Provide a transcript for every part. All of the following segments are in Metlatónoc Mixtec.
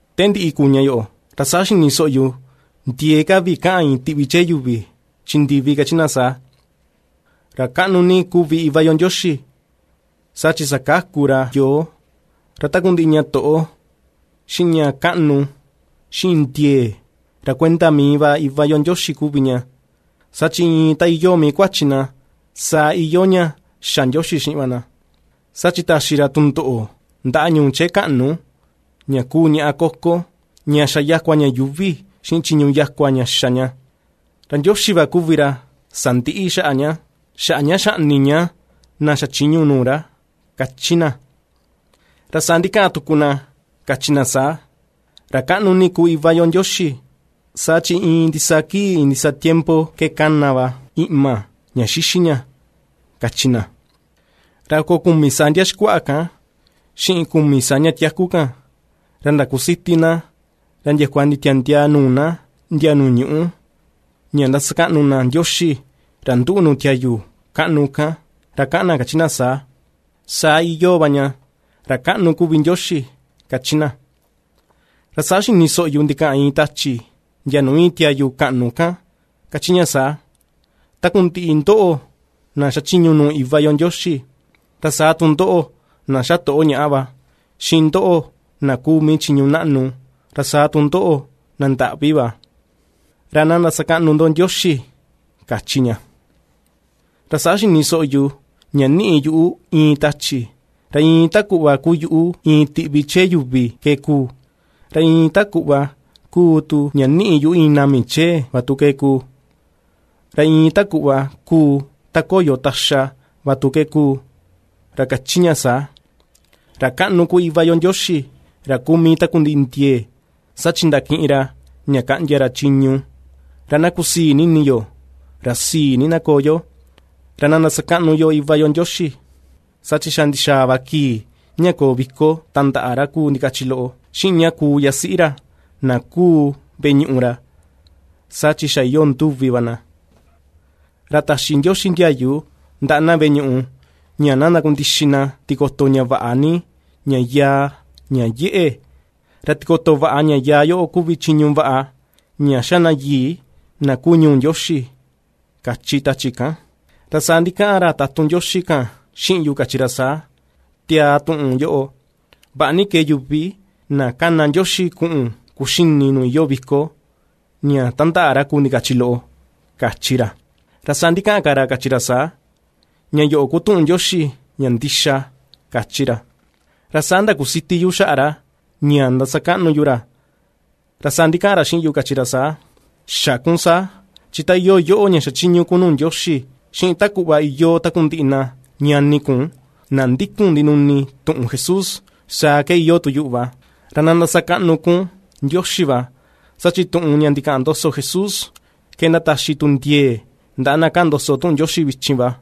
Te ndiꞌi kuu ña yoꞌo, ra saa xini soꞌo yu ndiee ka vi kaꞌan iin tiꞌvi chee yuvi chi ndivi kachi na saa: ¡Ra kaꞌnu ni kuvi Iva yo Ndioxi! ¡Saa chi sakaku ra yoo! Ra takundiꞌi ña toꞌo, xiꞌin ña kaꞌnu, xiꞌin ndiee, ra kuenda mii Iva yo Ndioxi va kuvi ña. Saa chi iin ta iyoo mii kuachi na, saa iyoo ña xa Ndioxi xiꞌin va na, saa chi taxi ra tundoꞌo ndaꞌa ñuu chee kaꞌnu ña ^kuu ñaꞌá koko, ña xa yakua ña yuuvi xiꞌin chiñu yakua ña xa ña, ra Ndioxi va kuvi ra sandiꞌi xaꞌa ña, xaꞌa ña xaꞌni ña na xachiñu nuu ra, ^kachi na. Ra saa ndikaꞌan tuku na kachi na saa: ―¡Ra kaꞌnu ni kuu Iva yo Ndioxi! Saa chi iin ndisaa kii iin ndisaa tiempo ke ^kana va iꞌma, ña ^xixi ña ―kachi na. Ra oko kumi saa ndia xikuaꞌa kan, xiꞌin kumi saa ña tiaku kan, ra ndakusiti na ra ndiakua nditiandiaa nuu na ndia nuu ñuꞌú, ña ^ndasakaꞌnu na Ndioxi ra nduꞌu nuu tiayu kaꞌnu kan, ra kaꞌan na kachi na saa: ―¡Saa iyoo va ña! ¡Ra kaꞌnu kuvi Ndioxi! ―^kachi na. Ra saa xini soꞌo yu ndikaꞌan iin tachi ndia nuu íin tiayu kaꞌnu kan, ^kachi ña saa: Takundiꞌi ndoꞌo na ^xachiñu nuu Iva yo Ndioxi, ra saa tu ndoꞌo na ^xatoꞌo ñaꞌa va, xiꞌin ndoꞌo, na ku mii chiñu naꞌnu, ra saa tu ndoꞌo na ndaꞌvi va, ra ná ndasakaꞌnu ndo Ndioxi, kachi ña. Ra saa xini soꞌo yu ña níꞌi yuꞌu iin tachi ra iin ta kuꞌva kuu yuꞌu iin tiꞌvi chee yuvi ke kuu, ra iin ta kuꞌva kuu tu ña niꞌi yuꞌu iin nami chee va tu ke kuu; ra iin ta kuꞌva kuu ta koyo taxa va tu ke kuu, ra ^kachi ña saa: ¡Ra kaꞌnu kuvi Iva yo Ndioxi, ra kuu mii takundiꞌi ndiee, saa chi ndakiꞌin ra ña kaꞌndia ra chiñu! Ra na kusii ni ini yo, ra sii ni na koo yo, ra na ndasakaꞌnu yo Iva yo Ndioxi, saa chi xa ndixaa va kii, ña koo viko tandaꞌa ra kuu ndikachi loꞌo, xiꞌin ña kuu yasiꞌi ra, na kuu veꞌe ñuꞌu ra, saa chi xa iyoo nduvi va na. Ra taxi Ndioxi ndiayu ndaꞌa na veꞌe ñuꞌu ña ná ndakundixi na tikoto ña vaꞌa ni, ña yaa, ña yeꞌe, ra tikoto vaꞌa ña yaa yoꞌo kuvi chiñu vaꞌa, ña ^xa na yii, na kuu ñuu Ndioxi, kachi tachi kan. Ra saa ndikaꞌan ra tatun Ndioxi kan xiꞌin yu kachi ra saa: ―Tiaa tuꞌun yoꞌo: “Vaꞌa ni kee yuvi na ^kana Ndioxi kuꞌun kuxini nuu iyoo viko, ña ^tandaꞌa ra ku ndikachi loꞌo”, kachi ra. Ra saa ndikaꞌan ka ra, kachi ra saa: ―Ña yoꞌo ku tuꞌun Ndioxi, ña ndixa ―kachi ra. Ra saa ndakusiti yu xaꞌa ra, ña ndasakaꞌnu yu ra, ra saa ndikaꞌan ra xiꞌin yu kachi ra saa: ―Xä kun saa chi ta iyoo yoꞌo ña xachiñu kun nuu Ndioxi, xiꞌin ta kuꞌva iyoo takundiꞌi na ñani kun na ^ndikun ndinuni tuꞌun Jesús, saa ke iyoo tu yuꞌu va. Ra na ndasakaꞌnu kun Ndioxi va. ―kachi ra. Saa chi tuꞌun ña ndikaꞌan ndoso Jesús ke ndataxi tu ndiee ndaꞌa na kaꞌan ndoso tuꞌun Ndioxi vichin va.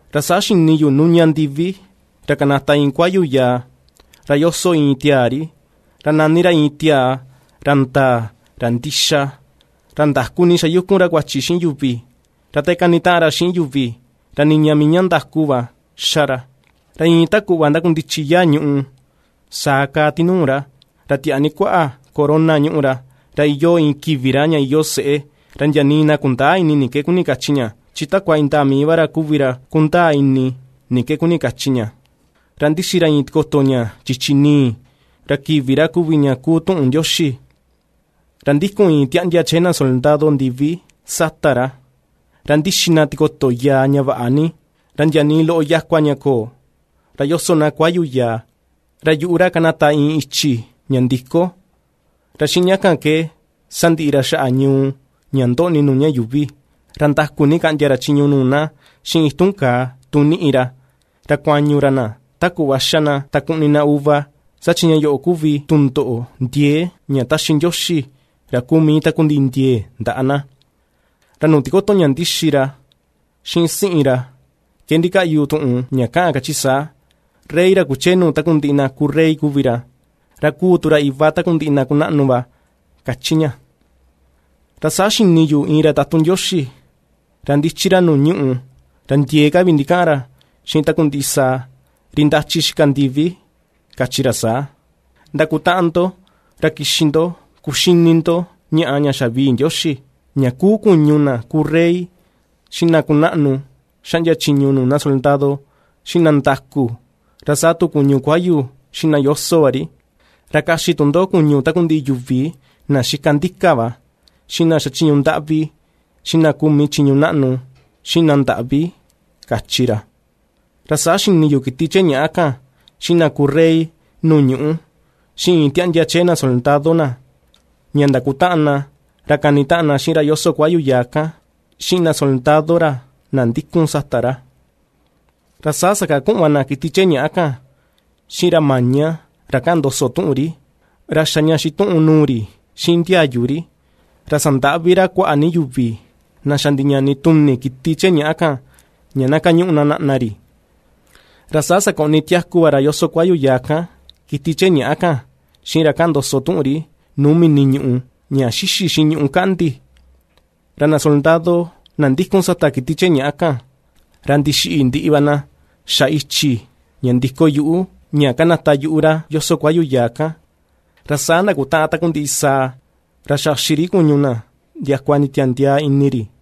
Ra saa xini yu ^nuña ndivi, ra kanata iin kuayu yaa, ra ^yoso iin tiaa ri, ra nani ra iin tiaa ra ndaa, ra ndixa; ra ndaku ni ^xayukun ra kuachi xiꞌin yuvi, ra te kanitaꞌan ra xiꞌin yuvi ra niña mii ña ndaku va ^xa ra. Ra iin ta kuꞌva ^ndakundichi yaa ñùꞌù saa kaa tinuu ra; ra tiaa ni kuaꞌa corona ñúꞌu ra, ra iyoo iin kivi ra, ña iyoo seꞌé, ra ndia nii na kundäa ini ni ke kuni kachi ña, chi takua indaa mii va ra kuvi ra kundaa ini ni ke kuni kachi ña. Ra ^ndixi ra iin tikoto ña chichi ni̱i̱, ra kivi ra kuvi ña kuu Tuꞌun Ndioxi. Ra ^ndikun iin tiaꞌndia chee na soldado ndivi sata ra, ra ^ndixi na tikoto yaa ña vaꞌa ni, ra ndia ni loꞌo yakua ña köo, ra ^yoso na kuayu yaa. Ra yuꞌu ra ^kanata iin ichi ña ndi̱kó, ra xiꞌin ña kan ke sandiꞌi ra xaꞌa ñuu ña ndoꞌni nuu ña yuuvi, ra ndaku ni kaꞌndia ra chiñu nuu na xiꞌin itun kaa, tu ^niꞌi ra; ra kuañu ra na ta kuꞌva ^xa na, ta kuꞌni na uva; saa chi ña yoꞌo kuvi tundoꞌo ndiee ña ^taxi Ndioxi ra kuu mii takundiꞌi ndiee ndaꞌa na. Ra nuu tikoto ña ^ndixi ra, xiꞌin siꞌin ra ke ndikaꞌyu tuꞌun ña kaꞌan kachi saa: “Rey ra kuchee nuu takundiꞌi na kuu rey kuvi ra, Ra kuu tu ra Iva takundiꞌi na kunaꞌnu va”, ^kachi ña. Ra saa xini yu iin ra tatun Ndioxi, ra ^ndichi ra nuu ñuꞌù, ra ndiee ka vi ndikaꞌan ra xiꞌin takundiꞌi sàà, ri ^ndachi xika nuu ndivi kachi ra saa: ―Ndakutaꞌan ndo, ra kixi ndo kuxini ndo ñaꞌa ña xavii Ndioxi, ña kuu kuñu na ku rey, xiꞌin na kunaꞌnu ^xaꞌndia chiñu nuu na soldado, xiꞌin na ndaku, ra saa tu kuñu kuayu xiꞌin na ^yoso va ri, ra kaxi tu ndo kuñu takundiꞌi yuvi na ^xika ndika va, xiꞌin na ^xachiñu ndaꞌvi, xiꞌin na ku mii chiñu naꞌnu, xiꞌin na ndaꞌvi ―kachi ra. Ra saa xini yu kiti chee ñàꞌa kan, xiꞌin na ku rey nuu ñuꞌú, xiꞌin iin tiaꞌndia chee na soldado na, ña ndakutaꞌan na ra kanitaꞌan na xiꞌin ra yoso kuayu yaa kan, xiꞌin na soldado ra, na ndikun sata ra. Ra saa saka kuꞌun va na kiti chee ñàꞌa kan, xiꞌin ra maña ra kaꞌan ndoso tuꞌun ri, ra xa ña xituꞌun nuu ri xiꞌin ndiayu ri, ra sandaꞌvi ra kuaꞌa ni yuvi na xa ndiñani tuni kiti chee ñaꞌa kan, ña na kañuꞌu na naꞌna ri. Ra saa sakoꞌni tiaku va ra yoso kuayu yaa kan kiti chee ñaꞌa kan xiꞌin ra kaꞌan ndoso tuꞌun ri nuu mini ñuꞌù ña ^xixi xiꞌin ñuꞌú kaꞌndi. Ra na soldado, na ^ndikun sata kiti chee ñàꞌa kan ra ndixiꞌi ndiꞌi va na xa ichi ña ndi̱kó yuꞌu, ña ^kanata yuꞌu ra yoso kuayu yaa kan. Ra saa ndakutaꞌan takundiꞌi sàà, ra xaxi ri kuñu na ndiakua nditiandiaa ini ri.